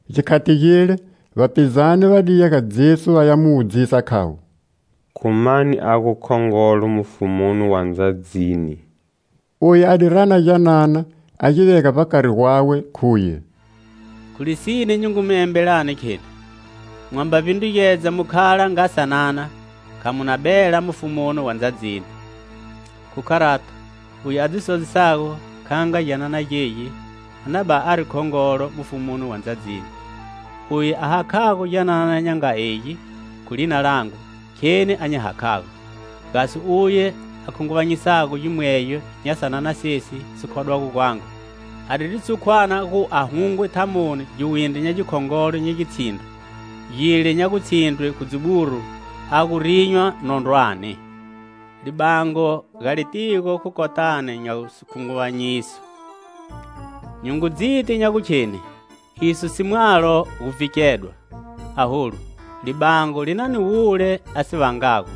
Gikhati gile, vapizane va di ya ga Jesu vaya mu wudzisa, khavo: "Khu mani a gu khongolo mufumuni wa ndzadzini?" Uye a di rana gyanana a gi vega vbakari gwawe, khuye: "Khu lisine nyi ngu mi embelani, kheni: mwamba vbindrugedza mu khala nga sanana, kha mu na bela mufumuni wa ndzadzini. Khu kharato, uye a dzi sodzisago kha nga gyanana gegi a na bani ari khongolo mufumuni wa ndzadzini. Uye a hakhago gyanana nya nga egi, khu lina langu, kheni a nyi hakhago. "Gasi uye a khunguvanyisago gimwegyo nya sanana sesi si khodwago gwangu, a diri tshukwana gu a hungwe thamoni giwindri nya gikhongolo nya gitshindro, gile nya gutshindrwe khu dziburu, a gu rinywa nondrwani. Libango ga litigo khu kotani nya sikhunguvanyiso! Nyi ngu dziti nya gukheni iso si mwalo gu vhikedwa; aholu, libango li na ni wule a si vangago!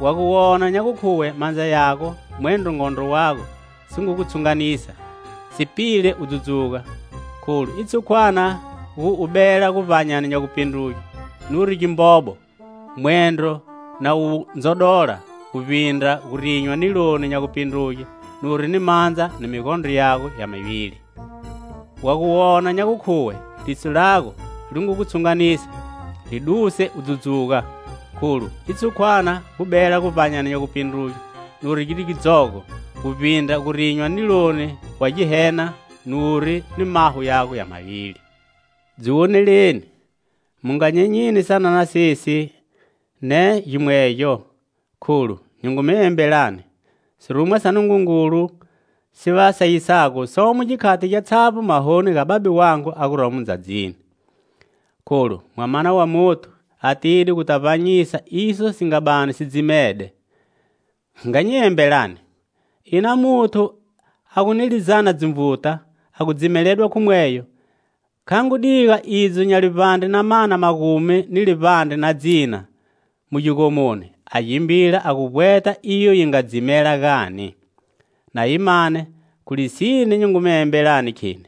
Wa gu wona nya gukhuwe mandza yago mwendro ngondro wago si ngu gu tshunganisa, si pile u dzudzuga, kholu i tshukwana gu u bela guvbanyani nya gupindruge nuri ni gimbobo mwendro na wu ndzodola, guvbindra gu rinywa niloni nya gupindruge nuri ni mandza ni migondro yago ya mivili. Wa gu wona gu khuwe liso lago li ngu gu tshunganisa, li duse u dzudzuga, kholu i tshukwana gu bela guvbanyani nya gupindruge nuri ni gidzogo, guvbindra gu rinywa niloni wa Ghehena nuri ni maho yago ya mavili. Dzi woneleni, mu nga nyenyini sanana sesi, ne gimwegyo, kholu nyi ngu mi embelani: sirumwa sa Nungungulu si va sayisago, somo gikhati gyatshavbo mahoni ga Babe wangu a guromo ndzadzini. [ Kholu Mwamana wa Muthu atide guta vbanyisa iso si nga bani si dzimede.] Nga nyi embelani: ina muthu a gu ni lizana dzinvuta, a gu dzimeledwa khu mweyo, kha ngu diga idzo nya livbandre na mana magumi ni livbandre na dzina mu gigomoni, a gimbila a gu vbweta iyo yi nga dzimela, gani? Na yi mane, khu lisine nyi ngu mi embelani, kheni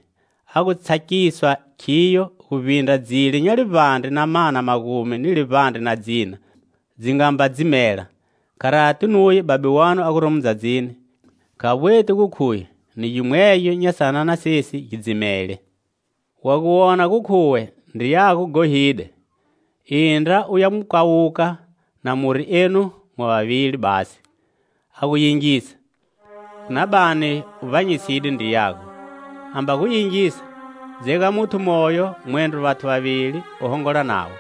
a ngu tsakiswa khiyo guvbindra dzile nya livbandre na mana magumi ni livbandre na dzina dzi nga mba dzimela. Kharati nuye Babe wanu a guromo ndzadzini kha vbweti gu khuye ni gimwegyo nya sanana sesi gi dzimele. "Wa gu wona gu khuwe ndriyago ghohide, indra u ya mu kawuka na muri enu mwa vavili basi. A gu yingisa, u na bani u vbanyiside ndriyago. Amba gu yingisa, dzega muthu moyo mwendro vathu vavili u hongola navo,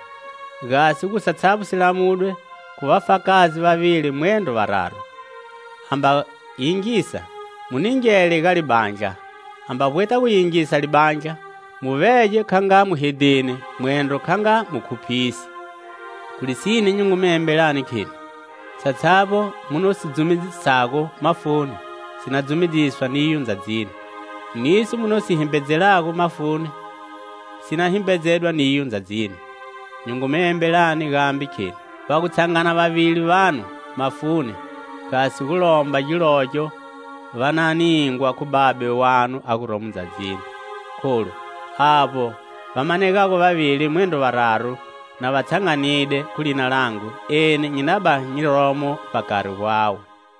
gasi gu satshavbo si lamudwe khu vafakazi vavili mwendro vararu. Amba va yingisa, mu ningele ga libandla; amba vbweta gu yingisa libandla, mu vege kha nga muhedheni mwendro kha nga mukhuphisi. "Khu lisine nyi ngu mi embelani, kheni: satshavbo mu no si dzumedzisago mafuni si na dzumedziswa niyo ndzadzini; niso mu na gu si himbedzelago mafuni si na himbedzedwa niyo ndzadzini. Nyi ngu mu embelani gambe, kheni: Va gu tshangana vavili vanu, mafuni, gasi gu lomba gilogyo, va na ningwa khu Babe wanu a guromo ndzadzini. Kholu avbo va manegago vavili mwendro vararu na va tshanganide, khu lina langu, eni nyi na bani nyi romo vbakari gwawe."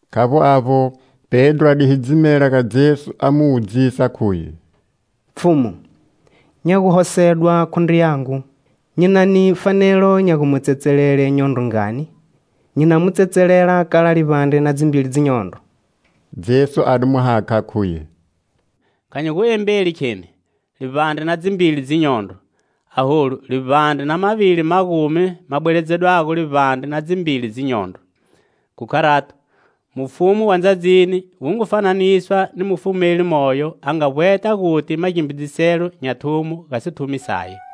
Khavbo avbo, Pedro a di hidzimela ga Jesu a mu wudzisa, khuye: "Pfhumu, nya guhosedwa khu ndriyangu, nyi na ni fanelo nya gu mu tsetselele nyondro ngani? Nyi na mu tsetselela kala livbandre na dzimbili dzinyondro?" Jesu a di mu hakha, khuye: "Kha nyi gu embeli, kheni: livbandre na dzimbili dzinyondro, aholu, livbandre na mavili magumi ma bweledzedwago livbandre na dzimbili dzinyondro. Khu kharato, mufumu wa ndzadzini wu ngu fananiswa ni mufumeli moyo a nga vbweta guti magimbidziselo nya thumo ga sithumi saye.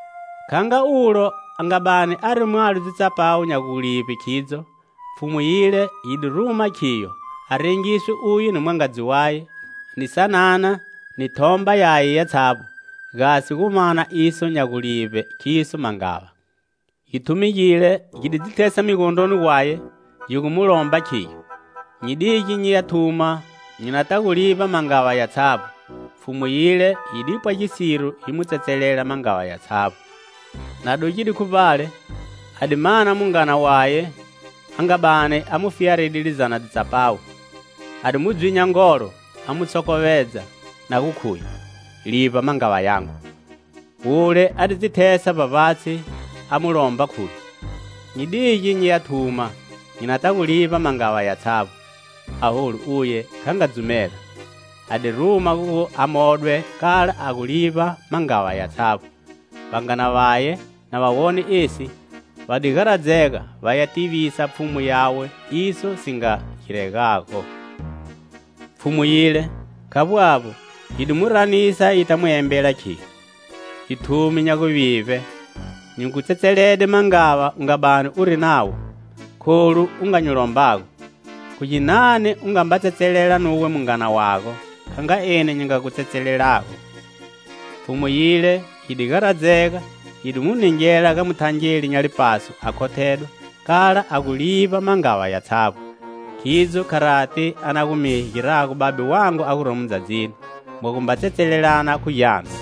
Kha nga ulo a nga bani ari mwalo dzitsapawu nya gulivbe khidzo, pfhumu yile yi di ruma khiyo a rengiswe uye ni mwangadzi waye, ni sanana, ni thomba yaye yatshavbo, gasi gu mana iso nya gulivbe khiso mangava. Githumi gile gi di dzi thesa migondroni gwaye, gi gu mu lomba, khigyo: 'Nyi dige nyi ya thuma, nyi nata gu livba mangava yatshavbo.' Pfhumu yile yi di pwa gisiro, yi mu tsetselela mangava yatshavbo. Na dugide khu vbale, a di mana mungana waye a nga bani a mu fiyaride lizana dzitsapawu. A di mu dzwinya ngolo, a mu sokhovedza, na gu khuye: 'Livba mangava yago!' Wule a di dzi thesa vbavbatshi, a mu lomba, khuye: 'Nyi dige nyi ya thuma, nyi nata gu livba mangava yatshavbo.' Aholu uye kha nga dzumela; a di ruma gu a modwe kala a gu livba mangava yatshavbo. Vangana vaye, na va wone esi, va di garadzega, vaya tivisa pfhumu yawe iso si nga giregago. Pfhumu yile, khavbo avbo, yi di mu ranisa yita mu embela, khiyo: 'Githumi nya guvivbe! Nyi gu tsetselede mangava u nga bani uri nawo, kholu u nga nyi lombago. Khu ginani u nga mba tsetselela nuwe mungana wago kha nga eni nyi nga gu tsetselelago?' Pfhumu yile, yi di garadzega, yi di mu ningela ga muthangeli nya lipaso a khothedwa kala a gu livba mangava yatshavbo. Khidzo kharati a na gu mi girago Babe wangu a guromo ndzadzini, mwamba tsetselelana khu gyanu."